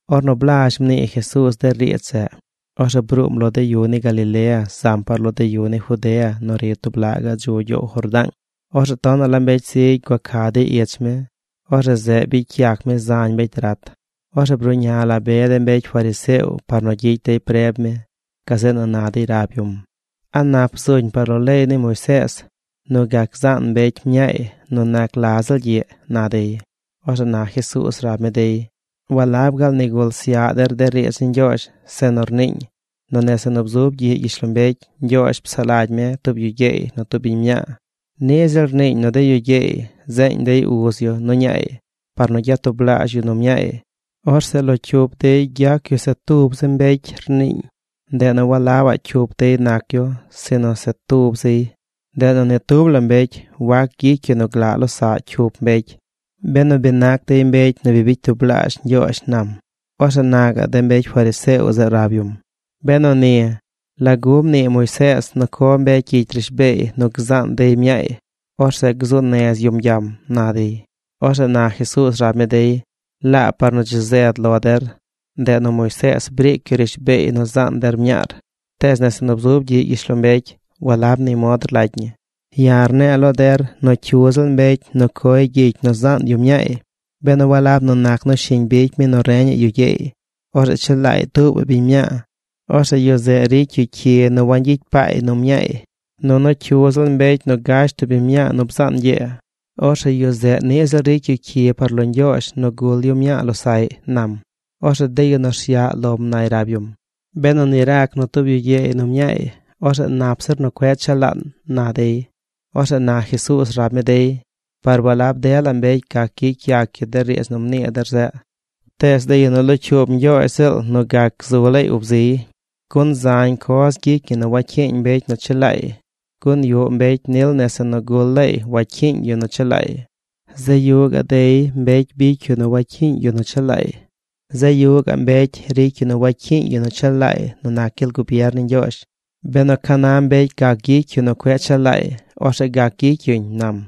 Ornu blazh mnii Jesuuz de riidz zeꞌ, orzeꞌ bruum lo de yu ni Galilea zam par lo de yu ni Judea nu ri tub laꞌ gaꞌ dzu gyoow Jordaang. Orzeꞌ tonaꞌ la mbecy zigy gua ca dey ich mi. Orzeꞌ zeꞌ bicy yac mi zañ mbecy rat. Orzeꞌ bruꞌña la be de mbecy fariseo par nu gyicy dey preb mi. Gazeꞌ nu na dey rab yum: ―¿A nap zuñ par lo leey ni Moisees nu gac zaan mbecy mñaay nu nac la ziꞌl gyiꞌ? ―na dey. Orzeꞌ na Jesuuz rab mi dey: ―¿Walab gaal nigul syaꞌ der de riidz ni Ñgyoozh, zeꞌ nu rniiñ nu nese nu bzub gyiꞌ gyishlombecy Ñgyoozh psaꞌ lagy mi tub yu gyeey nu tub biñ mñaa? Niꞌ ziꞌl rniiñ nu de yu gyeey zeeñ dey uz yu nu ñaay par nu gyatublaazh yu nu mñaay. Orzeꞌ lo cyup dey gyac yu se tub zi mbecy, rniiñ. Ndeꞌ nu walabaꞌ cyup dey nac yu sinu se tub ziy. Ndeꞌ nu ni tub la mbecy wac gyicy yu nu glaꞌ losaꞌ cyup mbecy, benu bi nac dey mbecy nu bi bicy tublaazh Ñgyoozh ―nam. Orzeꞌ na de mbecy fariseo zeꞌ rab yum: ―Benu ni, ¿lagu mnii Moisees nu co mbecy gyicy rishbeey nu gzaan dey mñaay, orzeꞌ gzu nez yum gyam? ―na dey. Orzeꞌ na Jesuuz rab mi dey: ―Laab par nu dzi zed lo der, ndeꞌ nu Moisees briic yu rishbeey nu zaan der mñaar. Tees nese nu bzub gyiꞌ gyishlombecy walab ni mod rlagy ñi. Ya̱ rne̱e̱ lo der nu cyu ziꞌl mbecy nu coy gyicy nu zaan yu mñaay, benu walab nu nac nu shiñ bicy mi nu reñaꞌ yu gyeey, orzeꞌ chelaay tuubaꞌ biñ mñaa, orzeꞌ yu zeꞌ ricy yu cyi nu wangyicy paay nu mñaay. (Nunu cyu ziꞌl mbecy nu gash tub biñ mñaa nu bzaan ñgyee, orzeꞌ yu zeꞌ niꞌ ziꞌl ricy yu cyi par lo Ñgyoozh nu gul yu mñaa losaꞌy) ―nam. Orzeꞌ de yu nu rsyaꞌ lom nay rab yum: ―Benu ni rac nu tub yu gyeey nu mñaay, orzeꞌ nap zir nu cueꞌ chelaan ―na dey. Orzeꞌ na Jesuuz rab mi dey: ―Par walab dela mbecy gac gyicy yac yu de riidz nu mnii der zeꞌ, tees de yu nu locyuub Ñgyoozh ziꞌl nu gac gzu laay ub ziy. Gun zañ coz gyicy ñi nu wacyiiñ mbecy nu chelaay. Gun yuꞌ mbecy nil nese nu gul laay wacyiiñ yu nu chelaay. Zeꞌ yuꞌ gaꞌ dey, mbecy bicy yu nu wacyiiñ yu nu chelaay. Zeꞌ yuꞌ gaꞌ mbecy ricy yu nu wacyiiñ yu nu chelaay nu nac gyel gubier ni Ñgyoozh. Benu ca na mbecy gac gyicy yu nu cueꞌ chelaay, orzeꞌ gac gyicy yuñ ―nam.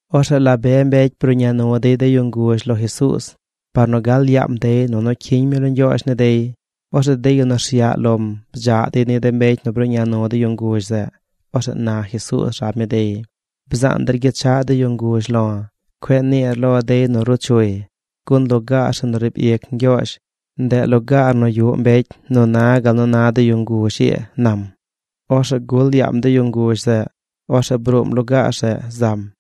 Orzeꞌ la be mbecy bruꞌña nu dey de yu nguzh lo Jesuuz par nu gal yaam dey nunu cyiñ mi lo Ñgyoozh ni dey. Orzeꞌ de yu nu rsyaꞌ lom bdzaꞌ dey ni de mbecy nu bruꞌña nu de yu nguzh zeꞌ. Orzeꞌ na Jesuuz rab mi dey: ―Bzaan der gyechaꞌ de yu nguzh lo̱. Cueꞌ niir lo dey nu ruu chuy. Gun lugaar zeꞌ nu riib ic Ñgyoozh, ndeꞌ lugaar nu yuꞌ mbecy nu na gal nu na de yu nguzh ii ―nam. Orzeꞌ gul yaam de yu nguzh zeꞌ. Orzeꞌ bruum lugaar zeꞌ zam.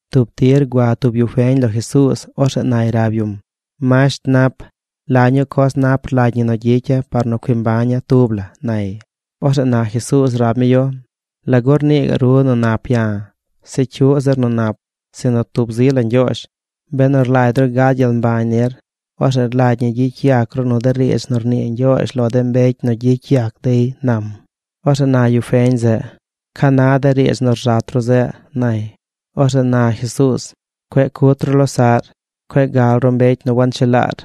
Tub tir gua tub yu feñ lo Jesuuz. Orzeꞌ nay rab yum: ―Masht nap, ¿la ñuu coz nap rlagy ñi nu gyicya̱ par nu cui mbaña̱ tub la? ―nay. Orzeꞌ na Jesuuz rab mi yu: ―¿Lagu rnii gaꞌ ru nu nap ya̱? Se cyuꞌ zir nu nap sinu tub zi la Ñgyoozh. Benu rlagy ru gad gyel mbañ nir, orzeꞌ rlagy ñi gyicy yac ru nu de riidz nu rnii Ñgyoozh lo de mbecy nu gyicy yac dey ―nam. Orzeꞌ na yu feñ zeꞌ: ―¿Ca na de riidz nu rzat ru zeꞌ? ―nay. Orzeꞌ na Jesuuz: ―Cueꞌ cut ru losaꞌr. Cueꞌ gal ru mbecy nu wanchelaar.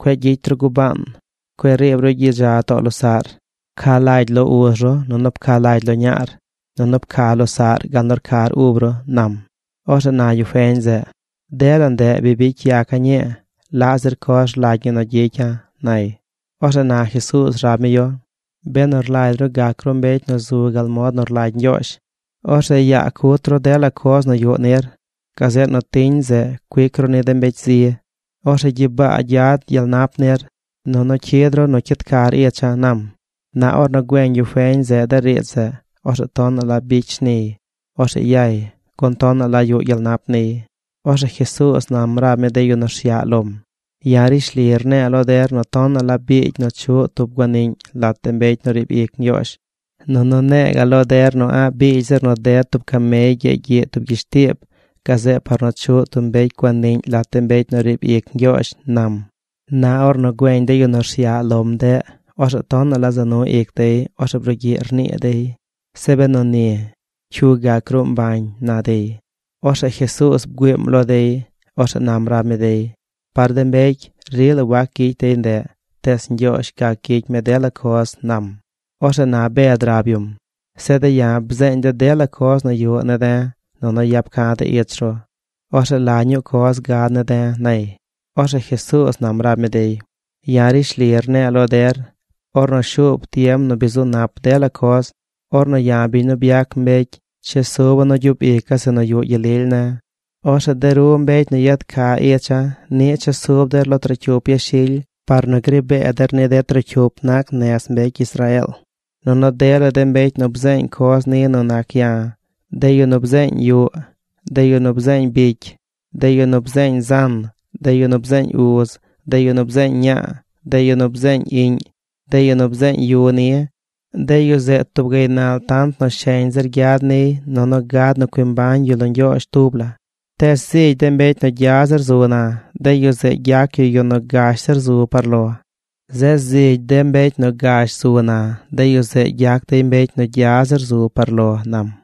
Cueꞌ gyicy ru gubaan. Cueꞌ riib ru gyidza too losaꞌr. Pca lagy lo uz ru nunu pca lagy lo ñaar, nunu pca losaꞌr gal nu rcar ub ru ―nam. Orzeꞌ na yu feñ zeꞌ: ―Dela ndeꞌ bi bicy yaca̱ ñii. ¿Laꞌ zir coz rlagy ñi nu gyicya̱? ―nay. Orzeꞌ na Jesuuz rab mi yu: ―Benu rlagy ru gac ru mbecy nu zu gal mod nu rlagy Ñgyoozh, orzeꞌ yaa cut ru dela coz nu yuꞌ nir. Gazeꞌ nu tiñ zeꞌ cuic ru ni de mbecy zi. Orzeꞌ gyibaa gyad gyel nap nir. Nunu cyid ru nu cyid car icha̱ ―nam. Na ornu güeñ yu feñ zeꞌ de riidz zeꞌ, orzeꞌ tonaꞌ la bicy shniy. Orzeꞌ yay. Gun tonaꞌ la yuꞌ gyel nap niy. Orzeꞌ Jesuuz nam rab mi de yu nu rsyaꞌ lom: ―Ya̱ rishli rne̱e̱ lo der nu tonaꞌ la biigy nu chuꞌ tub guaniꞌñ lat de mbecy nu riib ic Ñgyoozh. Nunu ne̱e̱ ga̱ꞌ lo der nu a̱ꞌ biigy zir nu ded tub camey gyeegy gyiꞌ tub gyishtiib gazeꞌ par nu chuꞌ tub mbecy guaniꞌñ lat de mbecy nu riib ic Ñgyoozh ―nam. Na ornu güeñ de yu nu rsyaꞌ lom ndeꞌ, orzeꞌ tonaꞌ la za nu ic dey. Orzeꞌ brugyiꞌ rnii dey: ―Zeꞌ benu ni, ¿cyu gac gruu mbañ? ―na dey. Orzeꞌ Jesuuz bgüiim lo dey. Orzeꞌ nam rab mi dey: ―Par de mbecy, rila wac gyicy dey ndeꞌ. Tees Ñgyoozh gac gyicy mi dela coz ―nam. Orzeꞌ na Bed rab yum: ―Zeꞌ de̱ ya̱ bzeeñ de̱ dela coz nu yuꞌ ne̱ de̱ nunu yap ca̱ de̱ ich ru. Orzeꞌ ¿la ñuu coz gad ne̱ de̱? ―nay. Orzeꞌ Jesuuz nam rab mi dey: ―Ya̱ rishli rne̱e̱ lo der, ornu shuub tiem nu bi zu nap dela coz, ornu ya̱ biñ nu byac mbecy, chesuba̱ nu gyub ica̱ zeꞌ nu yuꞌ gyel lily ne̱, orzeꞌ de ru mbecy nu yad ca icha̱ niꞌ chesub der lo trocyup yashily par nu gri bee der ni de trocyup nac nez mbecy Israeel. Nunu dela de mbecy nu bzeeñ coz ni nu nac ya̱, de yu nu bzeeñ yuꞌ, de yu nu bzeeñ bicy, de yu nu bzeeñ zan, de yu nu bzeeñ uz, de yu nu bzeeñ ñaa, de yu nu bzeeñ iꞌñ, de yu nu bzeeñ yu ni, de yu zeꞌ tub gaynal tant nu sheñ zir gyad niy nunu gad nu cui mbañ yu lo Ñgyoozh tub la. Tees zigy de mbecy nu gya zir zu na, de yu zeꞌ gyac yu yu nu gash zir zu par lo. Zeꞌ zigy de mbecy nu gash zu na, de yu zeꞌ gyac dey mbecy nu gya zir zu par lo ―nam.